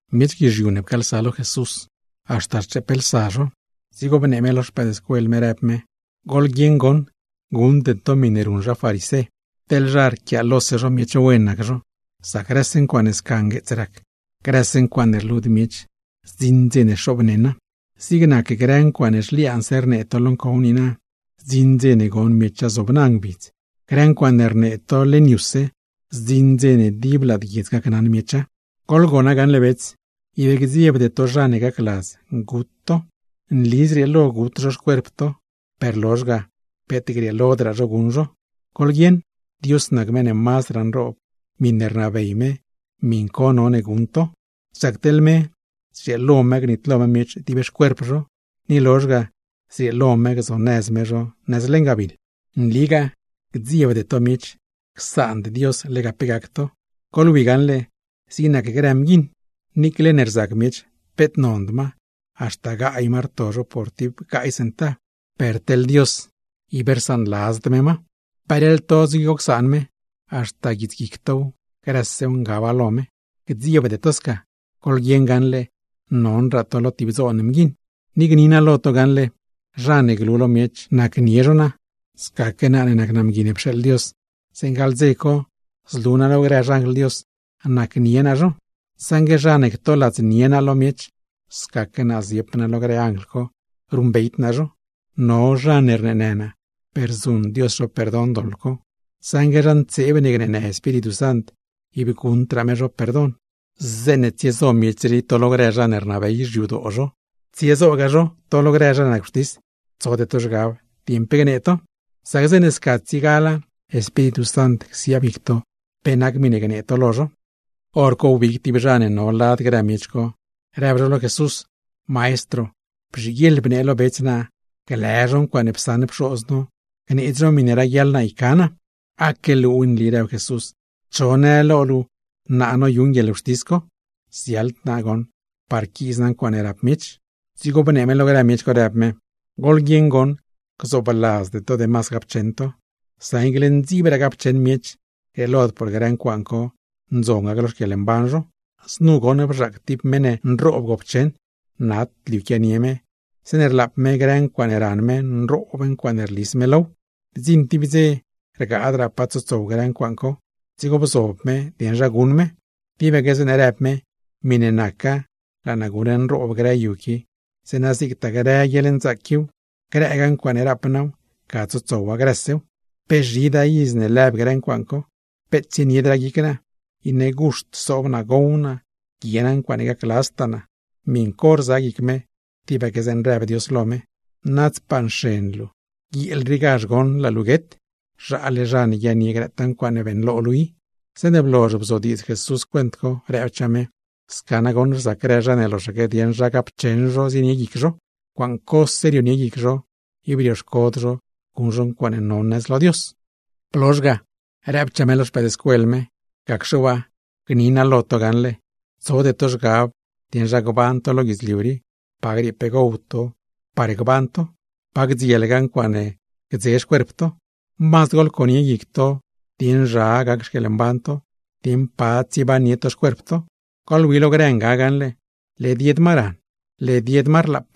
Miech guizhiu ne pcaalsa lo Jesús, haxta rcheeplsa zho. Dzigo bnee me lo xpëëdscuel me, rëb me: ―Goḻguieṉ goṉ, guṉde to miṉe ruṉ zha farisé, teḻ zha rquiaalose zho miech wen nac zho. Sac grëse ncuaaṉe sca ngueets rac, grëse ncuaaṉe rlud miech, zdziṉ dze ne xoobneṉa. ’Zig nac grë ncuaaṉe zhliaanse rnee to lo ncow niina, zdziṉ dze ne gon miecha zobna ngbidz; grë ncuaaṉe rnee to leṉ yuse, zdziṉ dze ne dib lad guiedz gacnaṉ miecha. ’Goḻgona gaṉle bets: Ib gdziebde to zha ne gacladz gut to. Nli zrieelo gut zho xcuerp to, per peet grieelodraa zho guṉ zho. Goḻguieṉ, Dios nac meṉ ne mazdraa nroob, miṉe rnabey me miṉ co none gon to. Sac teḻ me, zrieelo me gnitlo me miech dib xcuerp zho, ni lozh ga zrieelo me gzonëz me zho nëz leṉ gabiḻ. ’Nligaa gdziebde to miech, csaand Dios lega pe gac to. Goḻwi gaṉle, zig nac grë mguiṉ, niicle ne rzac miech peet nond ma, haxta chop ma rto zho por tib gaay centav; per teḻ Dios, ib rsaanladzd me ma. Peleḻ to dzigo csaan me, haxta guits guic tow, grësew ngaba lo me. Gdziebde to sca, goḻguieṉ gaṉle nonraa to lo tib dzoon mguiṉ. ’Ni gni naa lo to gaṉle, zha ne glu lo miech nacnie zho naa, scaque naa ne nac naa Mgui ne pxeeḻ Dios, zeeṉ gaḻ dze co zlu naa lo grë xanjl Dios, nacnie naa zho. Saṉgue zha ne ctoladznie naa lo miech, scaque naa ziep naa lo grë anjl co ruṉbeyd naa zho. No zha ne rneenë naa, per zuṉ Dios zho perdon doḻ co; saṉgue zha ntseeb ne gneenë Espíritu Sant, ib guṉdraa me zho perdon. ’Zeeṉe tsiezo miech rii to lo grë zha ne rnabey xyadoo zho, tsiezogaa zho to lo grë zha ne nac wxtis, tsode to zhgab dieṉ pe gnee to; sac zeeṉe sca tsiegala, Espíritu Sant csiaab guic to pe nac miṉe gnee to lo zho. Horco wbig tib zha ne no lad grë miech co, rëb zho lo Jesús: ―Maestro, bzhiguieḻ bnee lo bets naa glë zho ncuaaṉe psaṉ pxoz no, gneedz zho miṉe raguiaḻ naa yca naa. ―Aque luuw nli ―rëb Jesús―, ¿cho në lo luu laa naa noyuṉ guieḻwxtis co? Ziaḻd naa goṉ par quiiz naa ncuaaṉe rap miech. Dzigo bnee me lo grë miech co, rëb me: ―¡Goḻguieṉ goṉ, gzoobladzde to demas gapcheṉ to! Sac niicle ndziibraa gapcheṉ miech, grieelod por grë ncuaaṉ co ndzon gac lo xquieḻmban zho. Znu goṉ bzhaac tib meṉ ne nroob gopcheṉ. Nat liu quianie me, zeeṉe rlaap me grë ncuaaṉe ran me, nroob ncuaaṉe rlis me low. Bdziṉ tib dze rgaadraa pa tsotsow grë ncuaaṉ co, dzigo bzob me dieṉ zha guṉ me. Tibaque zeeṉe rëb me: “Miṉe naca laa naa guṉ nroob grë yu qui, zeeṉa zigtaa grë guieḻnzaac quiw, grëragaa ncuaaṉe rap naa, ga tsotsowa grësew. ¡Pe zhidaa iz ne lëb grë ncuaaṉ co! Peet tsieniedraa guic naa, iṉe guxt sob naa, gow naa, guie naa ncuaaṉe gacladztaa naa.” Miṉ co rza guic me, tibaque zeeṉe rëb Dios lo me: “Nadzpaa nxen luu. Guieel riigazh goṉ laa luu guet. ¡Zhaale zha ne guiaaṉnie grëtaa ncuaaṉe beeṉlo luu i!” Zeeṉe blozh bzodiidz Jesús cuent co, rëbchaa me: ―Sca nagoṉ rzac grë zha ne loxaque dieṉ zha gapcheṉ zho zienie guic zho. Ncuaaṉ cose rionie guic zho, ib rioxcod zho guṉ zho ncuaaṉe non nëz lo Dios. Blozh ga, rëbchaa me lo xpëëdscuel me: ―Gacxe waa, gni naa lo to gaṉle: Tsode to zhgab dieṉ zha gban to lo guidzliu rii, pa griee pe gow to par gban to, pa gdzielgaa ncuaaṉe gdze xcuerp to. Mazd goḻconie guic to dieṉ zha gac xquieḻmban to, dieṉ pa tsiebannie to xcuerp to. ’Goḻwi lo grë nga gaṉle, led yed ma ran, led yed ma rlaap,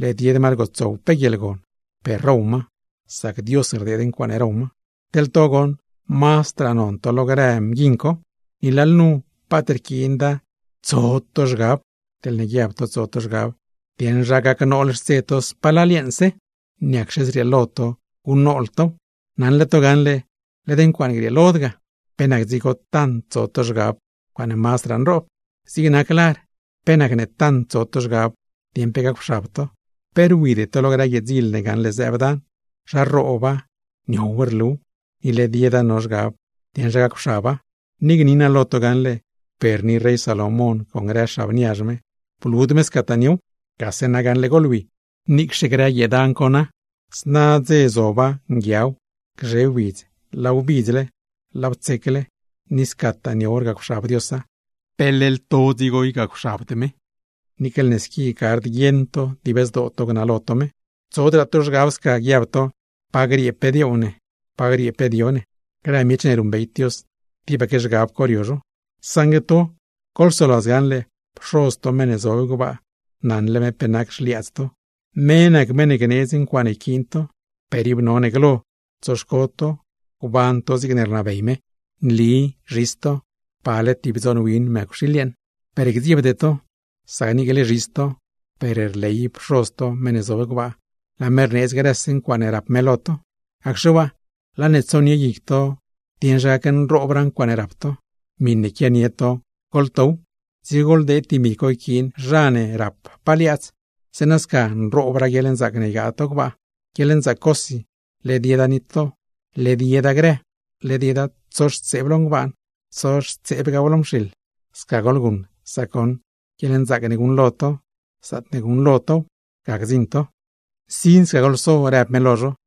led yed ma rgotsow pe guieḻgon, per row ma; sac Dios rdeed ncuaaṉe row ma. ¡Teḻ to goṉ, mazdraa non to lo grë mguiṉ co! Ni lalnu paat rquiinda tant tso to zhgab. Teḻne guiab to tso to zhgab dieṉ zha gacnool xtse to spalal yeeṉse, ¿niacxe zrieelo to guṉnool tow? Naṉle to gaṉle led ncuaaṉe grieelod ga. ¿Pe nac dzigo tant tso to zhgab ncuaaṉe mazdraa nroob? Zig nac lar, ¿pe nacne tant tso to zhgab dieṉ pe gacwxab to? Pe rwide to lo grë guiee dzil ne gaṉle zëëb dan, zha rrooba, niow rluw, ni led yeda rio zhgab dieṉ zha gacwxaba; ni gni naa lo to gaṉle, per ni rey Salomón con grë xab niazh me, blud me scataa niow. Gase na gaṉle goḻwi, niicxe grë guiee dan co na, zna dze zob nguiaw, gzhe widz laaw bidzle, laaw tsecle, ni scataa niow rgacwxab Diosa; ¿pe leḻ to dzigo ygacwxabd me, niicle ne squi gard guieṉ to dib zdoo to gnalo to me? ’Tsodraa to zhgab sca, guiab to: “¿Pa griee pe dioow ne, pa griee pe dio ne?” Grë miech ne ruṉbeyd Dios, tibaque zhgab co rio zho. Saṉgue to, goḻsoladz gaṉle Pxoz to meṉ ne zob gbaa, naṉle me pe nac grë xliaadz to. Me nac meṉ ne gneedz ncuaaṉe yquiin to, per ib none glo tsoxco to gban to zigne rnabey me. ’Nli zhis to, pale tib dzoon win mëcwxiil yeeṉ, per gdziebde to. Sac niicle zhis to, per rley Pxoz to meṉ ne zob gbaa, laa me rneedz grëse ncuaaṉe rap me lo to. Gacxe waa, laa ne tsonie guic to dieṉ zha gacnroob ncuaaṉe rap to, miṉe quianie to goḻtow, dzigo goḻdeed dimi co yquiin zha ne rappaa liaadz; zeeṉa sca nroobraa guieḻnzaac ne ygaa to gbaa. Guieḻnzaac cosi, led yeda nitlo, led yeda grë, led yeda tsoxtseeb lo ngbaan, tsoxtseebgaa lo mxiḻ. ’Sca goḻguṉ, sac goṉ guieḻnzaac ne guṉlo to, zaatne guṉlo tow, ga gdziṉ to. ’Nsin sca goḻso ―rëb me lo zho―.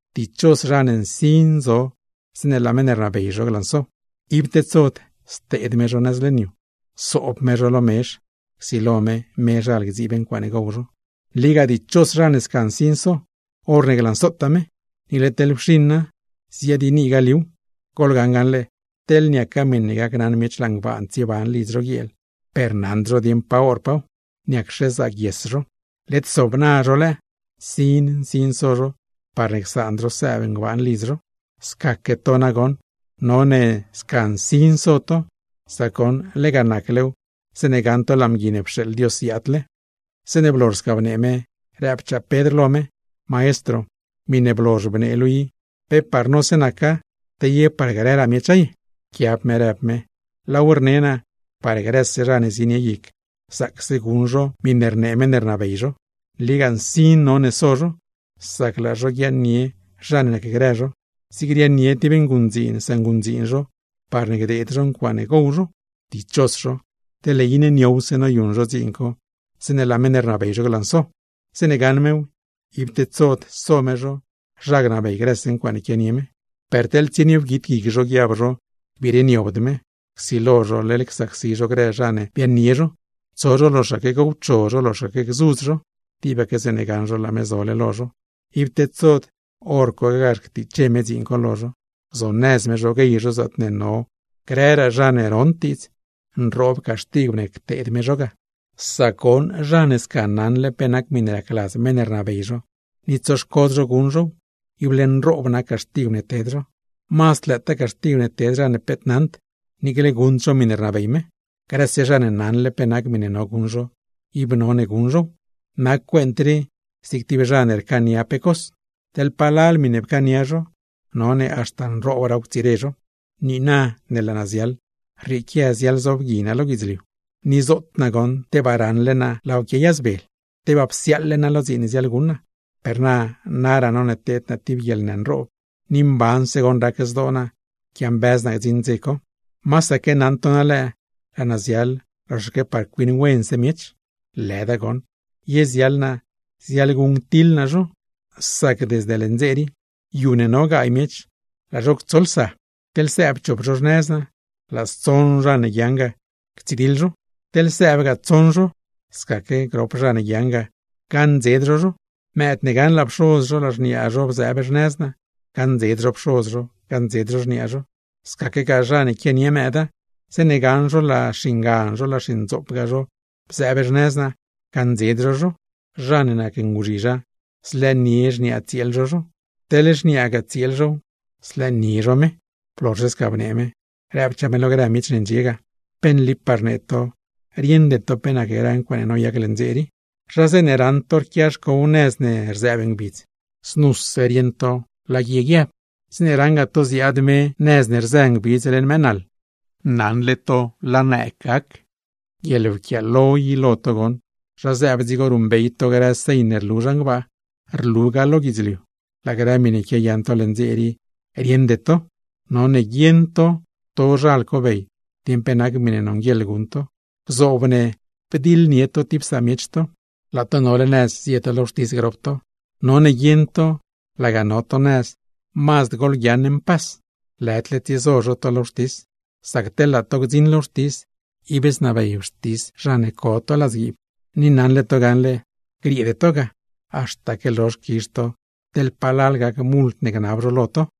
’Dichos zha ne nsin zo zeeṉe laa meṉ ne rnabey zho glanso. Ib tedsod, steed me zho nëz leṉ yu, soob me zho lo mezh, csilo me mezhal gdziib ncuaaṉe gow zho. Nligaa dichos zha ne sca nsin so, horne glansotaa me; niicle teḻ wxiṉa, ziadyiinigaa liuw. Goḻgaṉ gaṉle, teḻ niaca miṉe gacnaṉ miech laa ngbaan tsieban lidz zho guieel, per naṉd zho dieṉ pa horpaaw, ¿niacxe zaaguies zho? Led sobna zho lëë, nsin nsin so zho parne csaand zho sëëb ngbaan lidz zho. Scaque to nagoṉ, none sca nsin so to, sac goṉ lega naclew zeeṉe gaṉ to laa Mgui ne pxeeḻ Dios ziaadle. Zeeṉe blozh sca bnee me, rëbchaa Pedr lo me: ―Maestro, miṉe blozh bnee luu i, ¿pe par nose naca, te ye par grëraa miecha ye? Pquiab me rëb me: ―Laaw rne naa, par grëse zha ne zienie guic zaacse guṉ zho miṉe rnee meṉ ne rnabey zho. Nligaa nsin none so zho, sac laa zho guiaaṉnie zha ne nacgrë zho, zig riaaṉnie tib nguṉdziin sanguṉdziin zho parne gdeed zho ncuaaṉe gow zho. ’Dichos zho, teḻne iṉe niowse noyuṉ zho dziin co zeeṉe laa meṉ ne rnabey zho glanso. Zeeṉe gaṉ mew, ib tedsod so me zho, zha gnabey grëse ncuaaṉe quianie me. Per teḻ tsienie wguit guic zho guiab zho gbireniobd me, csilo zho leḻ csacsi zho grë zha ne biaaṉnie zho, tso zho loxaque gowcho zho, loxaque gzudz zho, tibaque zeeṉe gaṉ zho laa me zole lo zho; ib tedsod hor cogazh ctiche me dziin co lo zho, gzonëz me zho guey zho zaatne no grëraa zha ne rond diidz. Nroob caxtigw ne cteed me zho. ’Sac goṉ zha ne sca naṉle pe nac miṉe racladz meṉ ne rnabey zho, ni tsoxcod zho guṉ zhow; ible nroob nac caxtigw ne ted zho. Mazd lëëtaa caxtigw ted zha ne peet naṉd, niicle guṉd zho miṉe rnabey me. Grëse zha ne naṉle pe nac miṉe no guṉ zho, ib none guṉ zhow; nac cuent rii zig tib zha ne rcaania pe cos, teḻ palal miṉe pcaania zho, none haxta nroobraaw ctsire zho. ’Niina ne laa naa ziaḻ, rrieequia ziaḻzobgui naa lo guidzliu. ¡Ni zoot naa goṉ, tebaa raṉle naa laaw quiayazbel! ¡Tebaa psiaaḻle naa lo dziin ne ziaḻguṉ naa! Per na naraa none teed naa tib guieḻnë nroob, ni mbanse goṉ rac zdoo naa quiambëz naa gdziṉ dze co. ¿Masaque naṉ to na lëë, laa naa ziaḻ loxaque par cuiṉ wense miech? Lëda goṉ, ye ziaḻ naa ziaḻguṉctiḻ naa zho. Sac desde leṉ dze rii, yu ne no gaay miech, laa zho ctsolsa. Teḻ sëëb chop zho xnëz naa, laa stsoṉ zha ne guiaaṉ ga, ctsidiḻ zho; teḻ sëëbgaa tsoṉ zho, scaque grop zha ne guiaaṉ ga, gaṉdzed zho zho. Mëëd ne gaṉ laa pxoz zho, laa xniaagaa zho bzëëb xnëz naa, gaṉdzed zho pxoz zho, gaṉdzed zho xniaa zho; scaquegaa zha ne quianie mëëda, zeeṉe gaṉ zho laa xingan zho, laa xindzoopgaa zho bzëëb xnëz naa, gaṉdzed zho zho. Zha ne nac nguzhizha, zlëënie xniaa tsieel zho zho; teḻ xniaagaa tsieel zhow, zlëënie zho me. Blozhse sca bnee me, rëbchaa me lo grë miech ne ndxie ga: ―¡Pe nlipaa rnee to rieṉde to pe nac grë ncuaaṉe noyac leṉ dze rii! Zha zeeṉe raṉ to rquia xcow nëz ne rzëëb ngbidz, znuse rieṉ to laa guie guiab. Zeeṉe raṉgaa to ziaad me nëz ne rzë ngbidz leṉ mëë naḻ, naṉle to laa nëëg gac. ¡Guieḻwquiaalo i lo to goṉ! Zha zëëb dzigo ruṉbey to grë señ ne rlu zhan gbaa, rlugaa lo guidzliu, laa grë miṉe quiayaṉ to leṉ dze rii rieṉde to. ’¡None guieṉ to tozhal cobey dieṉ pe nac miṉe nonguieḻ guṉ to! Gzoob ne bdiḻnie to tib samiech to, laa to nole nëz zie to lo wxtis grop to. None guieṉ to, laga no to nëz mazd goḻguiaaṉ mpas, lëdle tsiezo zho to lo wxtis; sac teḻ laa to gdziṉ lo wxtis, ib znabey wxtis zha ne co to ladzguiib. Ni naṉle to gaṉle, grieede to ga, haxtaque lozh quizh to teḻ palal gac mult ne gnab zho lo to.